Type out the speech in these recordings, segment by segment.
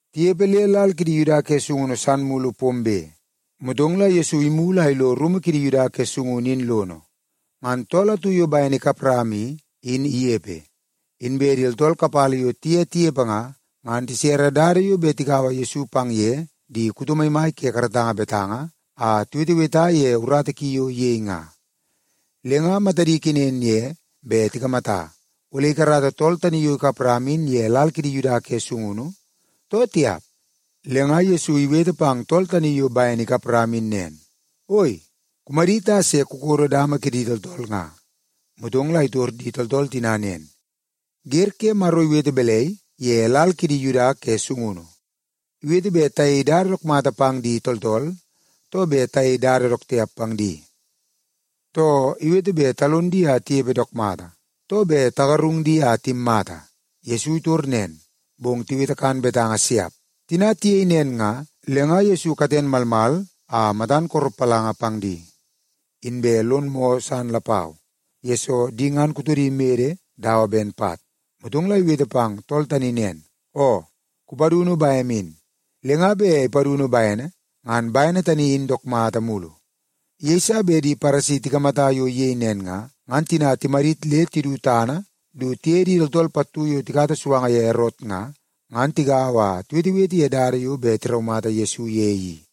Tinepe le lal kidi Yuda ke sungunu san mulu pombe, motong la Yesu imulu a ilo rumu kidi Yuda ke gaongo in lono, ngan tool atu yo bene ikap rama i, in inepe. Inbe di tooltool kapala yo tiye tinepe nga, ngan tisere dada yo bet tikaua Yesu pang ye di kuto maimai ke karatanga betanga a tiweteweta ye urata ki yo iyei nga. Le nga matadi kenen ye bet tikamata, ole ikarata tool tani yo ikap rama in ye lal kidi Yuda ke sungunu, too tiap. Le nga Yesu iwete pang tool tani yo bene ikap rama in nen, “Oi, kumadit a se kukodo dama kidi tooltool nga.” Motong la itor di tooltool tina nen, “Wer ke Maro iwete balai ye lal kidi Yuda ke sungunu? Iwete bet tayei dada dook mata pang di tooltool, too bet tayei dada dook tiap pang di? Too, iwete bet talon di a tinepe dook mata, too bet tagarung di a timmata?” Yesu itor nen, bong tiwete kan betanga siap. Tina tiyei nen nga, le nga Yesu katen malmal a matan koropalanga pang di. Inbe lon moo san lapau, yesoo di ngan kutodi mede dawa ben pat. Motong la iwete pang tool tani nen, “Oo, kupadunu bem in.” Le nga bet ipadunu bene, ngan bene tani in dook mata mulu. Yeiso bet di Paresi tikamata yo iyei nen nga, ngan tina timadit le tidu tana du tiye di tooltool pattu yo tikata suanga ye Erot nga, ngan tigaua a tiwetewete ye dada yo bet tiraumata Yesu ye i.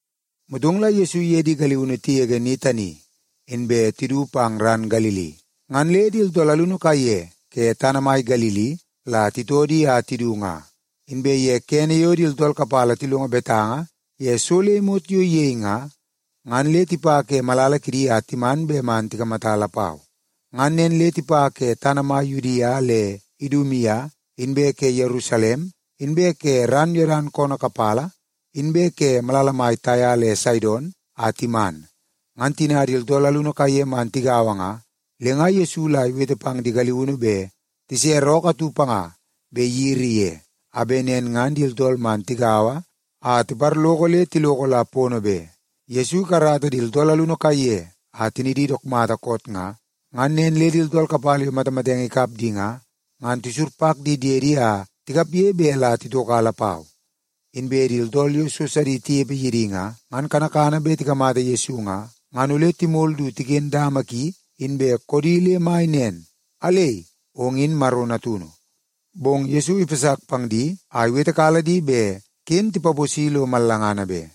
Motong la Yesu iye di galiunu tigege ni tani, inbe tidu pang ran Galili, ngan le di tooltool alunu kaiye ke tana mai Galili la titoo di a tidu nga. Inbe ye kene yo di tooltool kapala tilongo betanga ye so le imot yo iyei nga, ngan le tipa ke malala kidi a timan bet man tikamata lapau. Ngan nen le tipa ke tana mai Yudia le Idumia, inbe ke Yerusalem, inbe ke ran Yodan koonoo kapala, inbe ke malala mai Taia le Saidon a timan. Ngan tina di tooltool alunu kaiye man tigaua nga, le nga Yesu la iwete pang di galiunu bet tisere ookoo atu panga bet iyiri ye, a bet nen ngan di tooltool man tigaua a tiparloko le tiloko la pono be. Yesoo ikarata di tooltool alunu kaiye a tinidi dook mata koot nga, ngan nen le di tooltool kapala yo matamatenge ikap di nga, ngan tisurpak di diedi a tikapge bet la titoka lapau. Inbe di tooltool yo so sidi tinepe ye di nga, ngan kanakana bet tikamata Yesu nga, ngan ole timol du tiken dama ki inbe koodi le mai nen, “Alei, ong in Maro Natunu.” Bong Yesu ipasak pang di a iwetekala di bet ken tipaposi lo mallangana be.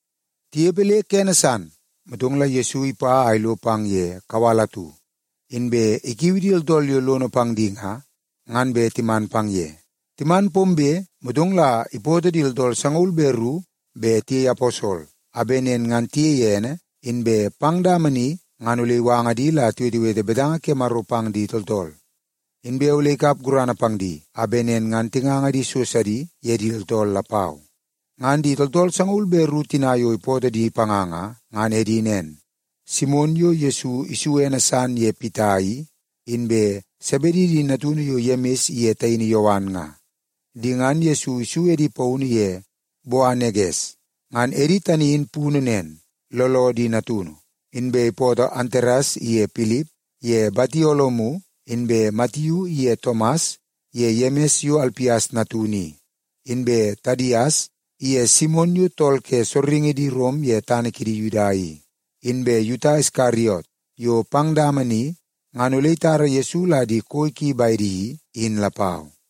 Tinepe le kene san, motong la Yesu ipa a ilo pang ye kawal atu, inbe ikiu di tooltool yo lono pang di nga, ngan bet timan pang ye. Timan pombe, motong la ipootoo di tooltool sangaul be ru bet tiyei aposol, a bet nen ngan tiyei ene, inbe pang dama ni ngan ole iwanga di la tiwetewete betanga ke Maro pang di tooltool. Inbe ole ikap gurana pang di, a bet nen ngan tinganga di so sidi ye di tooltool lapau. Ngan di tooltool sangaul be ru tina yo ipootoo di panga nga, ngan edi nen: Simon yo Yesu isu ene san ye Pita i, inbe Sebedi di natunu yo Yemis iye taini Yowan nga. Di ngan Yesu isu edi paunu ye Boaneges. Ngan edi tani in punu nen, Looloo di Natunu. Inbe ipootoo Antares iye Pilip, ye Batolomiu, inbe Matiu iye Tomas, ye Yemis yo Alpias natunu i, inbe Tadias iye Simon yo tool ke sorringi di Rom ye tana kidi Yuda i, inbe Yuta Iskariot yo pang dama ni ngan ole itara Yesu la di koi ki bedi i, in lapau.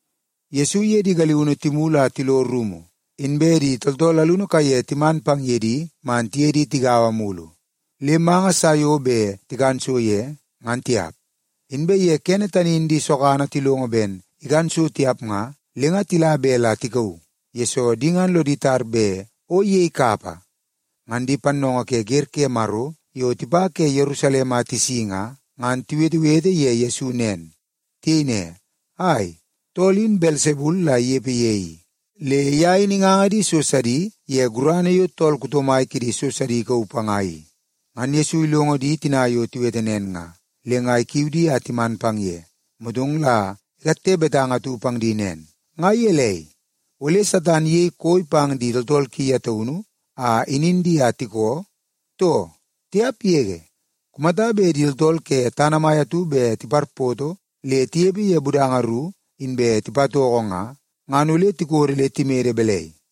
Yesu iye di galiunu timulu a tilo rumu, inbe di tooltool alunu kaiye timan pang ye di man tiye di tigaua mulu, le manga sa yo bet tikan so ye, ngan tiap. Inbe ye kene tani in di sogana tilongo ben ikan so tiap nga, le nga tila bet la tikauu, yesoo di ngan lodi tar bet o iyei kapa. Ngan di pannoongoo ke wer ke Maro yo tipa ke Yerusalem a tisi nga, ngan tiwetewete ye Yesu nen. Tiyei ne, “Ai, tool in Belsebul la inepe ye i. Le ye in inganga di so sidi ye gurana ke Belsebul yo tool kuto mai kidi so sidi i.” Ngan Yesu ilongo di tina yo tiwete nen nga, le nga ikiu di a timan pang ye, motong la ikatte betanga atu pang di nen, “Nga gelei, ole Satan iyei koi pang di tooltool ki ye taunu a inin di a tikoo, too? Tiap yege! Kumata bet di tooltool ke tana mai atu bet tiparpoto le tinepe ye budanga ru, inbe tipatoko nga, ngan ole tikodo le timede balai?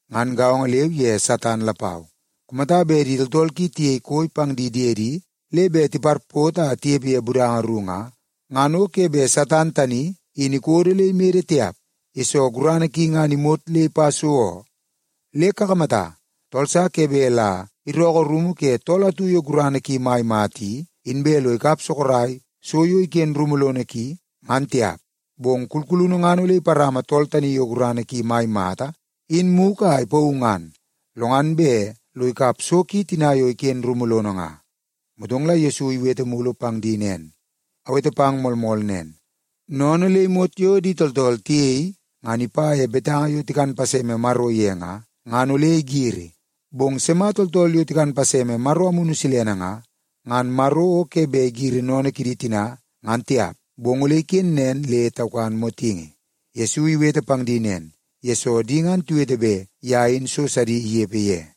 Ngan gaongo leu ye Satan lapau. Kumata bet di tooltool ki tiyei koi pang di diedi le bet tiparpoto a tinepe ye budanga ru nga, ngan o ke bet Satan tani in ikodo le imede tiap, yesoo gurana ki ngan imot le ipa so oo. Le kakamata, tool sa ke bet la irookoo rumu ke tool atu yo gurana ki mai mata i, inbe lo ikap sorok so yo iken rumu lono ki, ngan tiap. Bong kulkulunu ngan ole iparama tool tani yo gurana ki mai mata in mugu a ipauu ngan, lo ngan bet lo ikap so ki tina yo iken rumu lono nga.” Motong la Yesu iwete mulu pang di nen, “Awete pang moolmool nen, sennene le imot yo di tooltool tiyei, ngan ipa ye betanga yo tikan paseme Maro ye nga, ngan ole igiri. Bong di sima tooltool yo tikan paseme Maro Amunu Silene nga, ngan Maro o ke bet igiri sennene kidi tina ngan tiap, bong ole iken nen le taukan motingi.” Yesu iwete pang di nen, yesoo di ngan tiwete bet ye in so sidi inepe ye.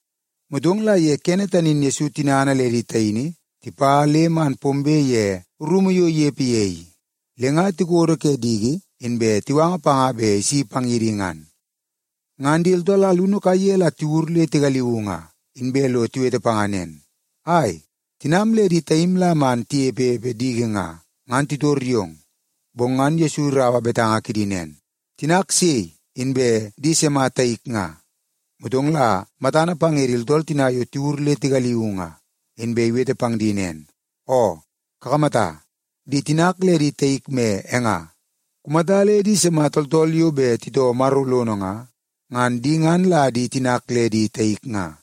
Motong la ye kene tani in Yesu tinana le di taini tipa le man pombe ye rumu yo inepe ye i, le nga tikodo ke diki inbe tiwanga panga bet isi pang ye di ngan. Ngan di tooltool alunu kaiye la tiwur le tigaliuu nga, inbe lo tiwete panga nen, “Ai, tinam le di taim la man tinepepe diki nga, ngan titor yong.” Bong ngan Yesu iraua betanga kidi nen, “Tinak sei, inbe di sima taik nga?” Motong la matana pang ye di tooltool tina yo tiwur le tigaliuu nga, inbe iwete pang di nen, “Oo, kakamata, di tinak le di taik me e nga. Kumata le di sima tooltool yo bet titoo Maro lono nga, ngan di ngan la di tinak le di taik nga.”